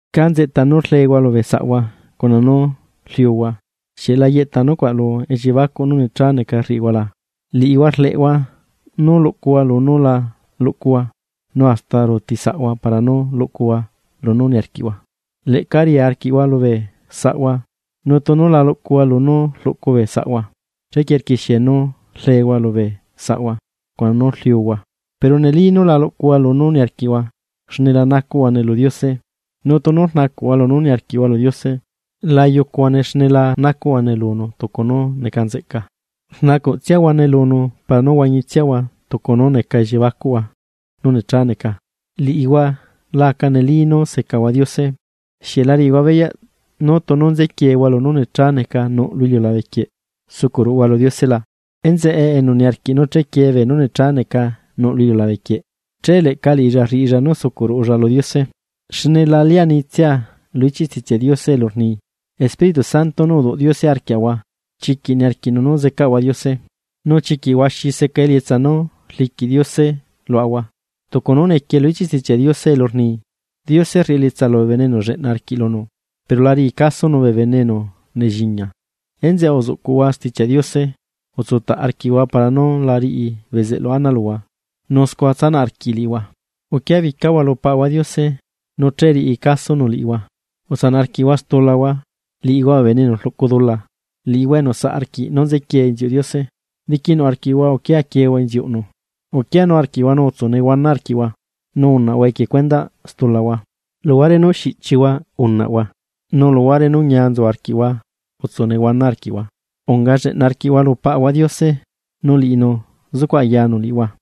¿Cá nzeꞌta nú rlehua lubee saꞌhua cuna nú rliuhua? ¿Xieꞌ la yeꞌta nucuaꞌ lu elliebacuꞌ nú necha neca rriꞌihuala? Liꞌihua rleꞌhua nú luꞌcuhua lunú la luꞌcuhua, nu hasta ruuti saꞌhua para nú luꞌcuhua lunú niarquiꞌhua, leꞌca riaa arquiꞌhua lubee saꞌhua, nu tunu la luꞌcuhua lunú rluꞌcu bee saꞌhua, chequie rquixie nú rlehua lubee saꞌhua, cuna nú rliuhua, pero neli nú la luꞌcuhua lunú niarquiꞌhua, xne la nacuꞌhuane lu Diose. Nu tunu rnacuꞌhua lunú niarquiꞌhua lu Diose, la yucuhuane xne la nacuꞌhuane lunu tucu nú neca nzeꞌca, rnacuꞌ tsiahuane lunu para nú huañitsiahua tucu nú neca elliebacuꞌhua nú necha neca. Liꞌihua la aca neli nú secahua Diose. ¿Xieꞌ la riꞌihua beyaꞌ nú tunu nzequiehua lunú necha neca nuꞌ lu iliulabe quieꞌ, sucuꞌ ruꞌuhua lu Diose la? Enzeꞌe enu niarquiꞌ nú chequie beenú necha neca nuꞌ lu iliulabe quieꞌ, che leꞌca liꞌilla rriꞌilla nú sucuꞌ ruꞌulla lu Diose. Xne la lianitsia lu ichiꞌ Stichiaꞌ Diose elu rni: “Espíritu Santo nú uduꞌ Diose arquiaꞌahua, chiquiꞌ niarquiꞌnu nú zecaꞌahua Diose.” Nu chiquiꞌ huaxi seca elietsa nú rliquiꞌ Diose luaꞌahua, tucu nú nequie lu ichiꞌ stichiaꞌnu elu rni: “Diose rriꞌi elietsa lubee bene enu lleꞌna arquiꞌ lunu.” Pero la riꞌi casonu bee bene enu nelliña. Enzeꞌe uzuꞌcuꞌhua Stichiaꞌ Diose. Utsutaꞌ arquiꞌhua para nú la riꞌi bezeꞌlu ana luhua, nu scua tsanaꞌ arquiꞌi liꞌihua. Uquiabicahua lu Paꞌahua Diose, nu che riꞌi casonu liꞌihua. Utsanaꞌ arquiꞌhua stulahua, liꞌihua bee bene enu rluꞌcu dula, liꞌihua enu saꞌ arquiꞌ nú nzequie inziuꞌ Diose, diquinuꞌ arquiꞌhua uquia quiehua inziuꞌnu. Uquianu arquiꞌhua nu utsu nehuana arquiꞌhua, nu unaꞌhua equie cuendaꞌ stulahua. Luhuare nú xiꞌchihua unaꞌhua, nu luhuare nú ñia nzu arquiꞌhua utsu nehuana arquiꞌhua. Aca lleꞌna arquiꞌhua lu Paꞌahua Diose, nu liꞌinu zucuꞌ ayanu liꞌihua.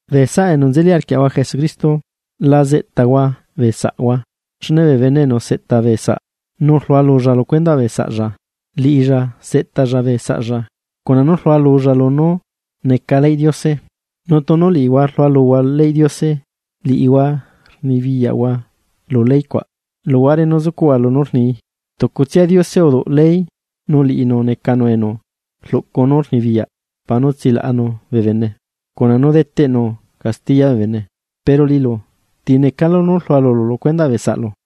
Bee saꞌa enu nzeli arquiaꞌahua Jesucristo, la zeꞌtahua bee saꞌhua, xne bee bene enu seꞌta bee saꞌ nu rlualulla lu cuendaꞌ bee saꞌlla, liꞌilla seꞌtalla bee saꞌlla cuna nú rlualulla lunú neca leyꞌ Diose. Nu tunu liꞌihua rlualuhua nú neca leyꞌ Diose, liꞌihua rnibiyaꞌhua lu ley cuaꞌ, luhuare nú zucuꞌhua lunú rnii. Tucutsia Diose uduꞌ ley nu liꞌinu necanu enu rluꞌcu nú rnibiyaꞌ para nú tsilaꞌanu bee bene, cuna nú deteꞌnu castiya bee bene. Pero liꞌilu, ¿ti necalu nú rlualulu lu cuendaꞌ bee saꞌlu?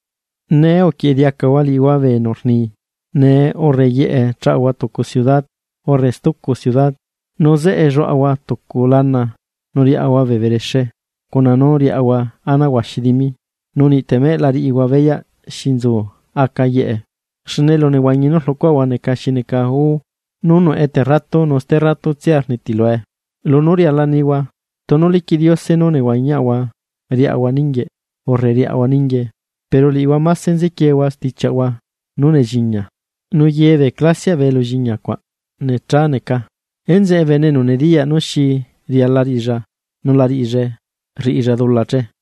Nee uquieꞌe diacahua liꞌihua bee enu rni: “Nee urre yeꞌe chaꞌahua tucu ciudad urre stucu ciudad, nu zeꞌe lluaꞌahua tucu lana nu riaꞌahua bee berexe, cuna nú riaꞌahua ana huaxi dimi”, nu niꞌ temeꞌ la riꞌihua beyaꞌ xi nzu aca yeꞌe. Xne elunehuañi nú rluꞌcuaꞌahua neca xi neca gú, nú nuꞌe terratu nu sterratutsia rnitilue. Lunú riala nihua: “Tunu liquiꞌ Diose nú nehuañiaꞌahua riꞌahua ninguieꞌ urre riꞌahua ninguie.” Pero liꞌihua máse nzequiehua stichiaꞌhua nú nelliña, nu ye bee clasiaꞌ bee elulliña cuaꞌ necha neca. Enzeꞌe bene enu nediyaꞌ nú xi riala riꞌilla nu la riꞌillae, rriꞌilla dula che.